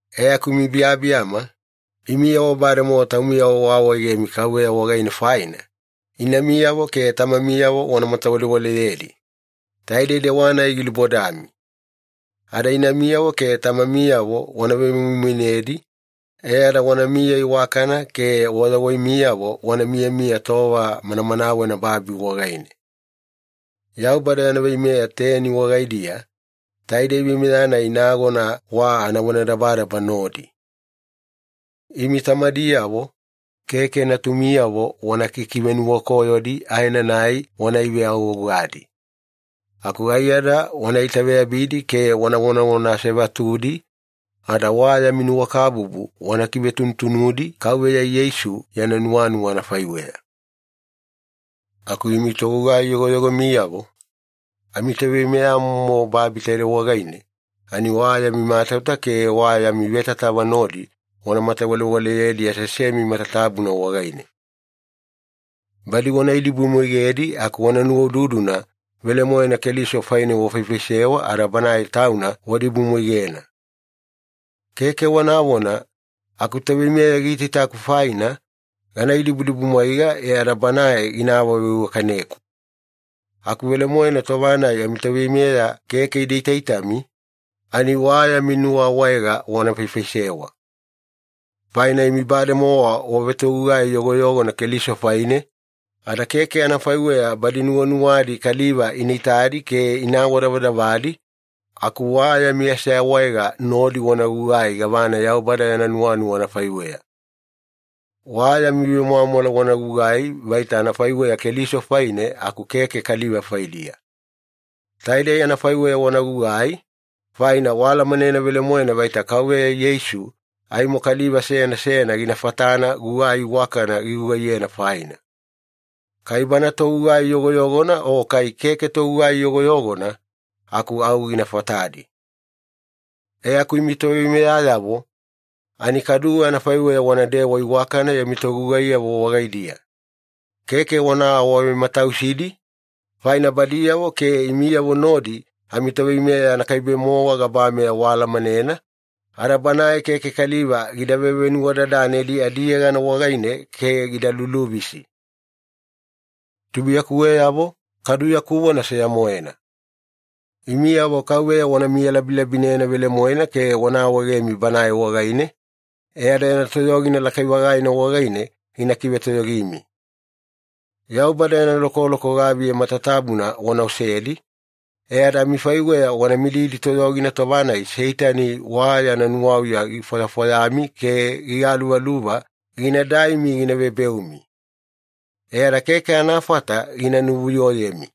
E aku imi biyabiyama, imiyavo bademowa taumiyavo waawaegemi Kauveya wagaine faina, inamiyavo ke tamamiyavo wana matawalewaleyedi. Taidei dewa-nai gilubodami. Ada “inamiyavo ke tamamiyavo wana vemoimoinedi, e ada wanamiya iwakana ke wayawaimiyavo wana miyamiya tova manamanawena babi wagaine.” Yaubada yana veimeya teni wagaidiya, taidei veimeya-nai nagona wa anavonadabadaba nodi. Imi tamadiyavo, keke natumiyavo wana kikivenuwakoyodi aenanai wana iveagougadi. Aku aiyada wana itaveyabidi ke wana vonavona asevatudi, ada wa yami nuwakabubu wana kivetuvetunudi Kauveya Yeisu yana nuwanuwa anafaiweya. Aku imi togugai yogoyogomiyavo, amitoveimeyamomo babi taidei wagaine ani wa yami matauta ke wa yami vetatava nodi wana matawalewaleyedi aseasemi matatabuna wagaine. Badi wana idibumwaigedi aku wana nuwaududuna, velemoena Keliso faine wafaifaisewa ada Banae Tauna wadibumwaigena. Keke wanavona, “Akutoveimeya giitaitaku faina, gana idibudibumwaiga e ada banae gina awaveiwakaneku.” Aku velemoena tova-nai amitoveimeya keke ida itaitami, ani wa yami nuwaawaega wana faifaisewa. Faina imi bademowa wavetogugai yogoyogona Keliso faine, ada keke anafaiweya badi nuwanuwadi kaliva ina itadi ke ina awadavadavadi, aku wa yami aseawaega nodi wana gugai gavana Yaubada yana nuwanuwa anafaiweya. Wa yami vemwamwala wana gugugai vaita anafaiweya Keliso faine aku keke kaliva faidiya. Taidei anafaiweya wana gugai, faina waalamanena velemoena vaita Kauveya Yeisu aimo kaliva seyana seyana gina fatana gugai iwakana gigugaiyena faina. Kai bana togugai yogoyogona o kai keke togugai yogoyogona, aku au gina fatadi. E aku imi toveimeyayavo, ani kaduwe anafaiweya wanadewa iwakana yami togugaiyavo wagaidiya. Keke wana awavematausidi, faina badiyavo ke imiyavo nodi amiToveimeya anakaibe-mowa gabameya waalamanena, ada Banae keke kaliva gida vevenuwadadanedi adiyegana wagaine ke gida luluvisi. Tubuiyakuweyavo, kadu yaku vona seya-moena. Imiyavo Kauveya wana miyalabilabinena velemoena ke wana awaegemi Banae wagaine, e ada yana toyogina lakai-vagaina wagaine gina kivetoyogimi. Yaubada yana lokoloko gaviya matatabuna wana osedi, e ada amifaiweya wana mididi toyogina tova-nai Seitani wa yana nuwauya gifwayafwayami ke gigaluvaluva gina daimi gina vebeumi. E ada keke anafata gina nuvuyoyemi.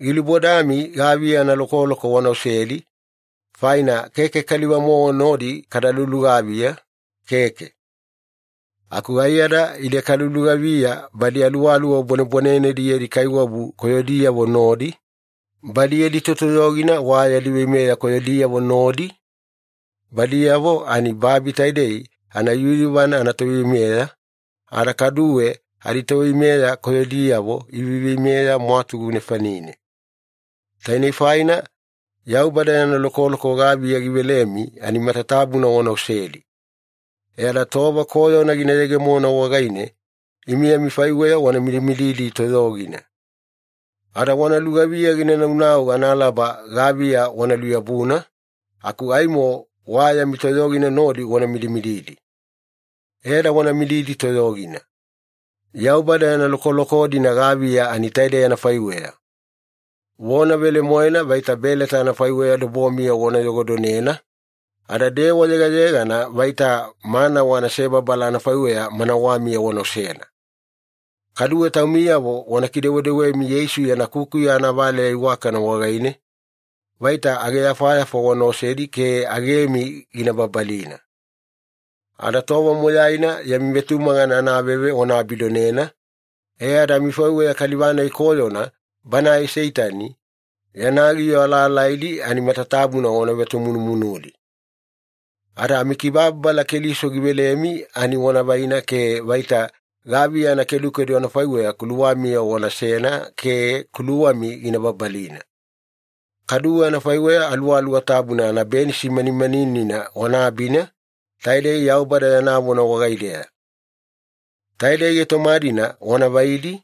Gilubodami gaviya analokoloko wana osedi, faina keke kaliva-mowa nodi kada lulugaviya, keke. Aku aiyada ide kalulugaviya badi aluwaluwa bwanebwanenedi yadi kaiwabu koyodiyavo nodi, badi yadi totoyogina wa yadi veimeya koyodiyavo nodi, badiyavo ani babi taidei anayuyuvana anatoveimeya, ada kaduwe aditoveimeya koyodiyavo iveiveimeya mwatugu nefanine. Tainei faina, Yaubada yana lokoloko gaviya givelemi ani matatabuna wana osedi. E ada tova koyona gina yegemona wagaine, imi amifaiweya wana midimididi toyogina. Ada wana lugaviya ginaunau analaba gaviya wana luyabuna, aku aimo wa yami toyogina nodi wana midimididi. E ada wana mididi toyogina. Yaubada yana lokoloko-dina gaviya ani taidei anafaiweya. Vona velemoena vaita beleta anafaiweya dobomiya wana yogodonena, ada dewa yegayegana vaita manawa anasebabala anafaiweya manawamiya wana osena. Kaduwe taumiyavo wana kidewedewemi Yeisu yana kukuya anavaleya iwakana wagaine, vaita ageyafayafa wana osedi ke agemi gina babalina. Ada tova moyaina yami vetumagana anaveve wana abidonena e ada amifaiweya kaliva-nai koyona, banae Seitani, yana giyo alaalaidi ani matatabuna wana vetomunumunudi. Ada amikibababala Keliso givelemi ani wana vaina ke vaita gaviya anakedukedu anafaiweya kuluwamiya wanasena ke kuluwami gina babalina. Kaduwe anafaiweya Aluwaluwa Tabuna anabenisi manimaninina wana abina, taidei Yaubada yana vona wagaideya. Taidei gaitoma-dina wana vaidi,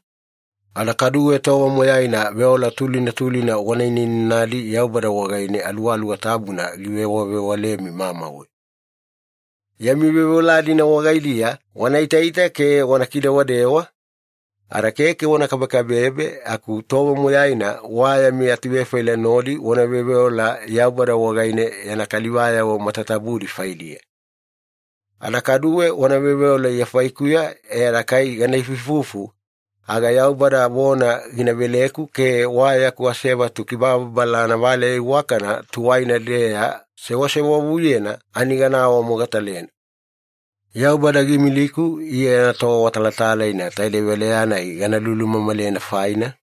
ada kaduwe tova moyaina veola tulina tulina wana inainanadi Yaubada wagaine Aluwaluwa Tabuna givewavewalemi mamauwe. Yami veoveola-dina wagaidiya wana itaita ke wana kidewadewa, ada keke wana kabekabebe aku tova moyaina wa yami atuvefaila nodi wana veoveola Yaubada wagaine yana kalivayavo matatabudi faidiya. Ada kaduwe wana veoveola Iya faikuya e ada kai gana ifuifufu, aga Yaubada vona gina veleku ke wa yaku asevatu kibababala anavaleya iwakana tuwaina-deya sewasewavuyena ani gana awamogatalena. Yaubada giimiliku Iya yana toawatalatalaina taidei valeya-nai gana lulumamalena faina,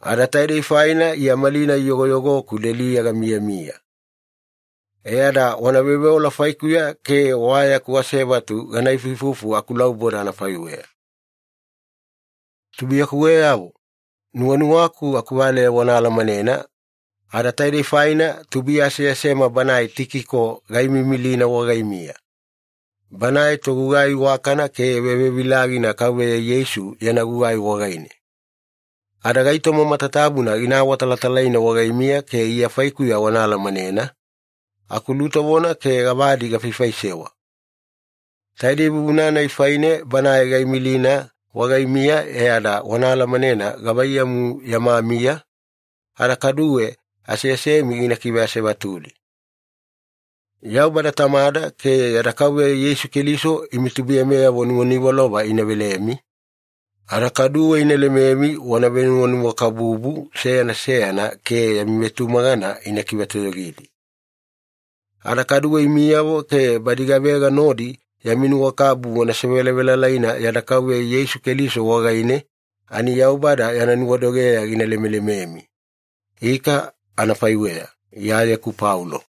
ada taidei faina Iya malinai yogoyogoku deliya gamiyamiya. E ada wana veoveola faikuya ke wa yaku asevatu gana ifuifufu akulauboda anafaiweya. Tubuiyakuweyavo, nuwanuwaku akuvaleya wana alamanena, ada taidei faina tubuiya aseasema banae Tikiko gaimiimilina wagaimiya. Banae togugai iwakana ke vevevilagina Kauveya Yeisu yana gugai wagaine. Ada gaitoma matatabuna gina awatalatalaina wagaimiya ke Iya faikuya wana alamanena, akulutovona ke gavadi gafaifaisewa. Taidei vuvuna-nai faine banae gaimilina wagaimiya e ada wana alamanena gavaiyamu yama miya, ada kaduwe aseasemi gina kiveasevatudi. Yaubada Tamada ke yada Kauveya Yeisu Keliso imi tubuiyameyavo nuwaniwalova ina velemi, ada kaduwe ina lememi wana venuwanuwakabubu seyana seyana ke yami vetumagana ina kivetoyogidi. Ada kaduwe imiyavo ke badi gavega nodi yami nuwakabubu wasevelavelalaina yada Kauveya Yeisu Keliso wagaine, ani Yaubada yana nuwadogeya gina lemelememi. Ika anafaiweya. Iyayeku Paulo